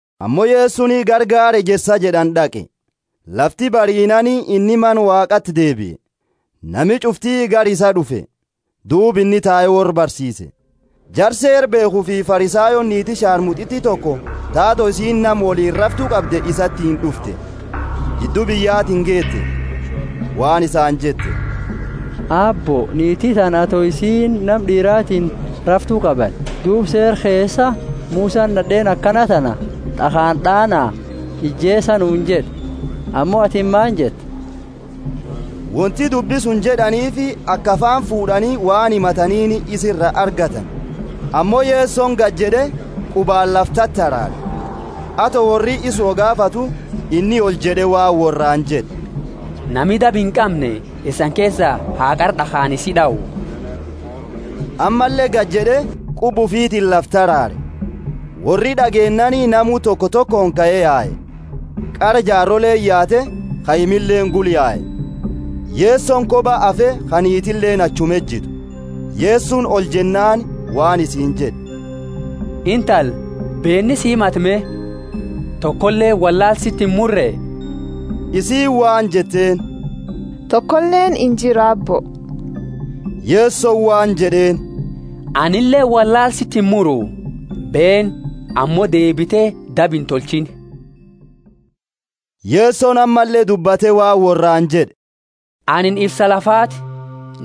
Ammo Yesoni gara gaara Ejersa jed'ani d'aqe. Lafti bariinaani inni Mana Waaqati deebie. Nami ch'ufti gara isaa d'ufe, duuba inni tae worra barsiise. Jara Seera beekhufi Farisayooni niiti sharmut'iti toko ta ato isiini nama woliini raftu qabde isatiini d'ufte, jiddu biyyatiini geete, Waan isaani jette, Aabbo niiti tana ato isiini nama d'iiratini raftu qabani. Duuba Seera keesa Musani nad'eeni akana tana, D'akhaani d'aana, ijeesa nuuni jed'e. Ammo atini maani jetta? Wonti dubbi suni jed'aniifi aka afaani fuud'ani waan himataniini isa iraa argatani, ammo Yesoni gajed'e, qubaani lafa tataraare. Ato worri isa wo gaafatu, inni oljed'e waan worraani jed'e, Nami daba inqamne isani keesa ha qara d'akhaani isi d'au. Ammalle gajed'e, quba ufiitini lafa taraare. Worri d'ageennaani namu toko tokooni kae yae, qara jaaroleeni yaate, kaimilleeni gula yae. Yesoni koba hafe ka niitileeni achuma ejitu. Yesoni oljennaani waan isiini jed'e, Intala, beeni si himate me? Tokoleeni wollaala siti imurre? Isiini waan jetteeni, Tokoleeni injiru, Aabbo. Yesoni waan jed'eeni, Anileeni wollaala siti imuru. Beeni, ammo deebite daba intolchiini.] Yesoni ammalle dubbate waan worraani jed'e, Anini ifsa lafaati.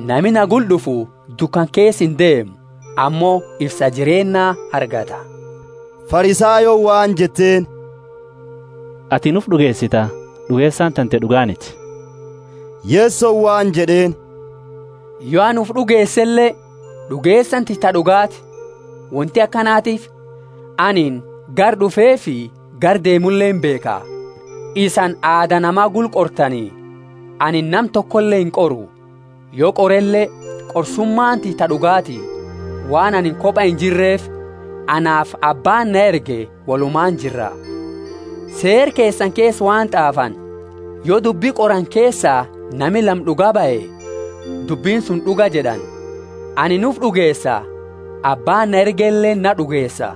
Nami na gula d'ufu dukana keesa indeemu, ammo ifsa jireennaa argata. Farisayooni waan jetteeni, Atini ufi d'ugeesita, d'ugeesani tante d'ugaaniti. Yesoni waan jed'eeni, Yo ani ufi d'ugeesele, d'ugeesani tiyya ta d'ugaati; wonti akanatiifi anini gara d'ufeefi gara deemule imbeekha. Isani aada nama gula qortani, anini nama tokole inqoru. Yo qorele, qorsumaani tiyya ta d'ugaati, waan anini koba injirreefi; anaafi Abbaani na erge wolumaani jirra. Seera keesani keesa waan t'aafani, yo dubbi qorani keesa nami lama d'uga bahe, dubbini suni d'uga jed'ani. Anini ufi d'ugeesa, Abbaani na ergeleeni naa d'ugeesa.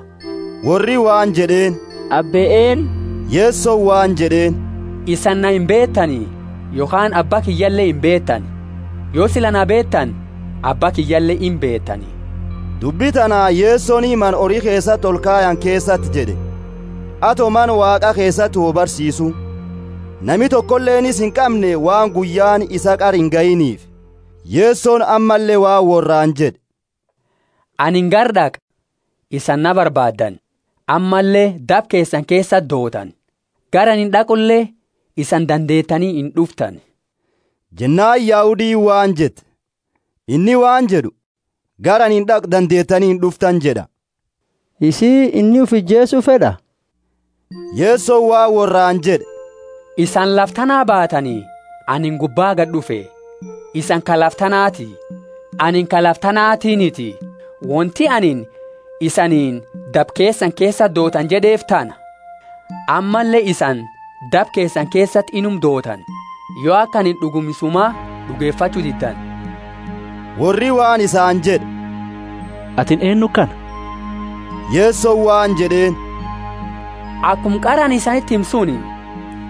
Worri waan jed'eeni, Abbe eennu? Yesoni waan jed'eeni, Isani na imbeetani, yokhaani Abba kiyyale imbeetani. Yo sila na beetani, Abba kiyyale imbeetani. Dubbi tana Yesoni mana hori keesati olkayani keesati jed'e, ato Mana Waaqa keesati wo barsiisu. Nami tokoleeni isa inqamne waan guyyaani isaa qara ingayiniifi. Yesoni ammalle waan worraani jed'e, Anini gara d'aqa; isani na barbaaddani, ammalle daba keesani keesati dootani. Gara ani d'aqule isani dandeetani ind'uftani. Jennaani Yahudiini waan jette, Inni waan jed'u, Gara ani d'aqu dandeetani ind'uftani jed'a. Isii, inni ufi ijeesu fed'a? Yesoni waan worraani jed'e, Isani lafa tanaa baatani, anini gubbaa gad'ufe. Isani ka lafa tanati, anini ka lafa tanaatiiniti. Wonti anini, Isaniini daba keesani keesati dootani jed'eefi tana. Ammalle isani daba keesani keesati inuma dootani, yo aka anini d'uguma Isuma d'ugefachu diddani. Worri waan isaani jed'e, Atini eennu kana? Yesoni waan jed'eeni, Akuma qara anini isaniti hime suni.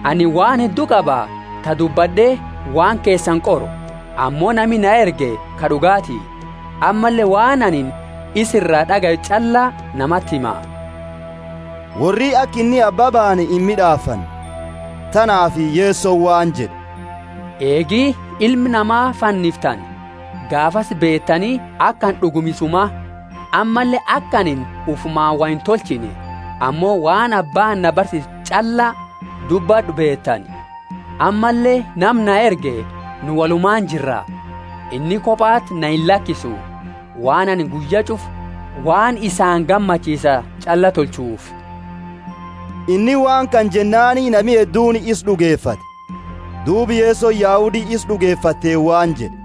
Anini waan heddu qaba, ta dubbad'e waan keesani qoru, ammo nami na erge ka d'ugaati, ammalle waan anini isa ira d'agaye ch'alla namati hima. Worri aka inni Abba baane imid'aafanne. Tanaafi Yesoni waan jed'e, Eegi Ilma Nama fanniftani, gaafasi beetani aka ani d'uguma Isuma; ammalle aka anini ufumaani wo intolchine, ammo waan Abbaani na barsiise ch'alla dubbad'u beetani. Ammalle nama na erge nu wolumaani jirra; inni kobati na illakisu, waan anini guyya ch'ufa waan isaani gammachiisa ch'alla tolchuufi. Inni waan kana jennaani nami hedduuni isa d'ugefate. Duuba Yesoni Yahudi isa d'ugefateeni waan jed'e,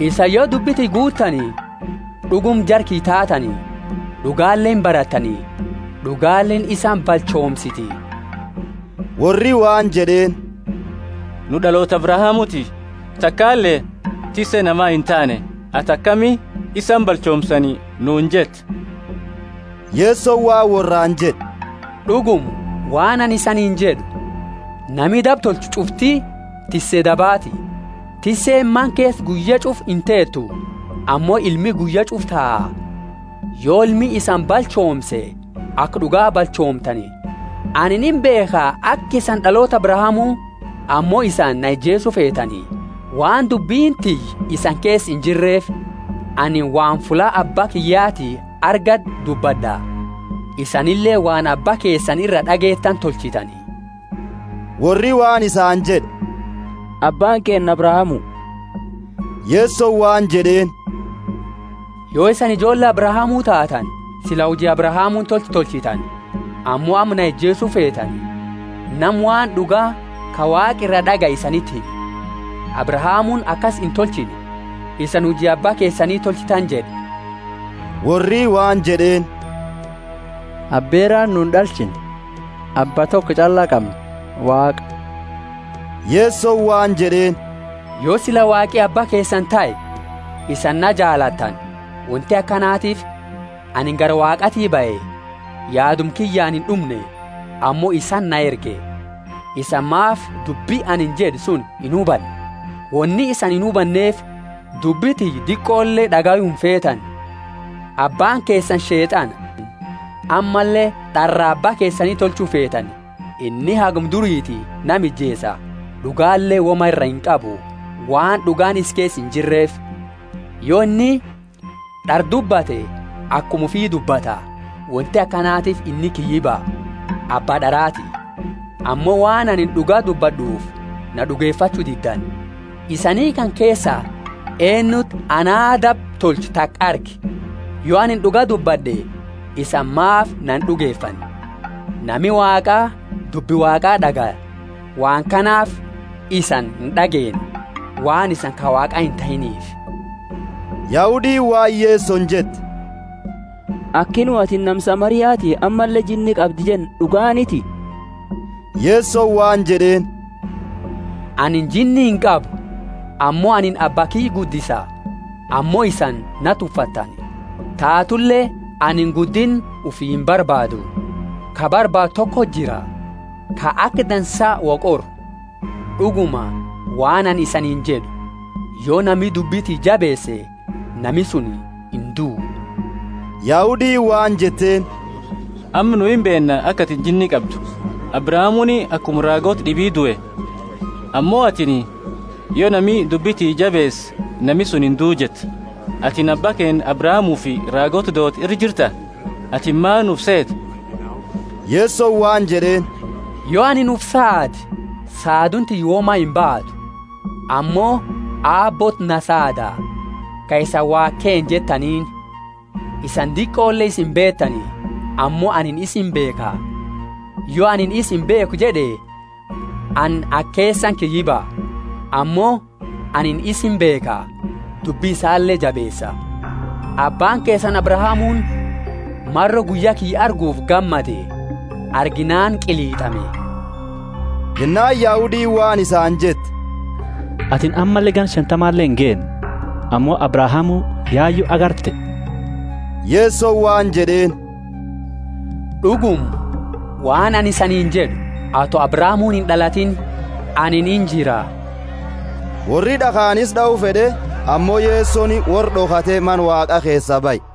Isani yo dubbi tiyya guuttani, d'uguma jara kiyya taatani; d'ugale imbarattani, d'ugaleeni isani balchoomsiti. Worri waan jed'eeni, Nu d'aloota Abrahamuti, takale tisse nama intaane; ati akami, Isani balchoomsani nuuni jetta? Yesoni waan worraani jed'e, D'uguma, waan anini isaniini jed'u, Nami daba tolchu ch'ufti tisse dabaati. Tisseeni mana keesa guyya ch'ufa inteetu, ammo ilmi guyya ch'ufa taa. Yo Ilmi isani balchoomse aka d'uga balchoomtani. Anini imbeekha aka isani d'aloota Abrahamu. Ammo isani na ijeesu feetani, waan dubbini tiyya isani keesa injirreefi. Anini waan fulla Abba kiyyati arge dubbad'a, isanileeni waan abba keesani ira d'ageetani tolchitani. Worri waan isaani jed'e, Abbaani keenna Abrahamu. Yesoni waan jed'eeni, Yo isani ijoolle Abrahamu taatani, sila huji Abrahamuuni tolche tolchitani. Ammo amma na ijeesu feetani, nama waan d'uga ka Waaqa iraa d'agaye isaniti hime. Abrahamuuni akasi intolchine! Isani huji Abba keesani tolchitani jed'e. Worri waan jed'eeni, Aberaani nu ind'alchine, Abba toko ch'alla qamna, Waaqa. Yesoni waan jed'eeni, Yo sila Waaqi Abba keesani tahe, isani na jaalattani; wonti akanatiifi anini gara Waaqaati bahe, yaaduma kiyyaani ind'umne, ammo isati na erge. Isani maafi dubbi anini jed'e suni inhubanne? Woni isani inhubanneefi dubbi tiyya diqole d'agayu imfeetani. Abbaani keesani Sheet'ana, ammalle d'araa abba keesani tolchu feetani. Inni haguma duriiti nama ijeesa, d'ugale woma ira inqabu, waan d'ugaani isa keesa injirreefi. Yo inni d'ara dubbate akuma ufi dubbata; wonti akanatiifi inni kiyyiba, abba d'araati. Ammo waan anini d'uga dubbad'uufi na d'ugefachu diddani. Isani kana keesa eennuti anaa daba tolchu taka arge? Yo ani d'uga dubbad'e, isani maafi na ind'ugefanne? Nami Waaqaa dubbi Waaqaa d'agaya, waan kanaafi isani ind'ageenne, waan isani ka Waaqaa intahiiniifi. Yahudiini waan Yesoni jette, Aki nu, Atini nama Samariati ammalle jinni qabda jenne d'uganiti? Yesoni waan jed'eeni, Anini jinni inqabu, ammo anini Abba kiyya guddisa, ammo isani na tuffattani. Taatule anini guddinna ufi imbarbaadu. Ka barbaadu tokoti jira, ka aka dansa wo qoru. D'uguma, waan anini isaniini jed'u, Yo nami dubbi tiyya jabeese, nami suni induu. Yahudiini waan jetteeni, Amma nu imbeenna aka atini jinni qabdu! Abrahamuuni akuma raagoota d'ibi due. Ammo atini, Yo nami dubbi tiyya jabeese, nami suni induu jetta. Atini abba keenna Abrahamufi raagoota doote ira jirta? Atini maani ufi seeta? Yesoni waan jed'eeni, Yo anini ufi saade, saaduuni tiyya woma imbaatu. Ammo Aabbooti na saada, ka isani Waaqa keenna jettaniini. Isani diqole isa imbeetani, ammo anini isa imbeekha, Yo anini, Isa imbeekhu jed'e, anini aka keesani kiyyiba. Ammo anini isa imbeekha, dubbi isale jabeesa. Abbaani keesani Abrahamuuni maro guyya kiyya arguufi gammade. Arginaani qilit'ame. Jennaani Yahudiini waan isaani jette, Atini ammalle ganna shantamale ingeenne, ammo Abrahamu yayu agarte? Yesoni waan jed'eeni, D'uguma, waan anini isaniini jed'u, Ato Abrahamu ind'alatiini, anini injira. Worri d'akhaani isa d'au fed'e, ammo Yesoni worra d'okhate Mana Waaqa keesaa bahe.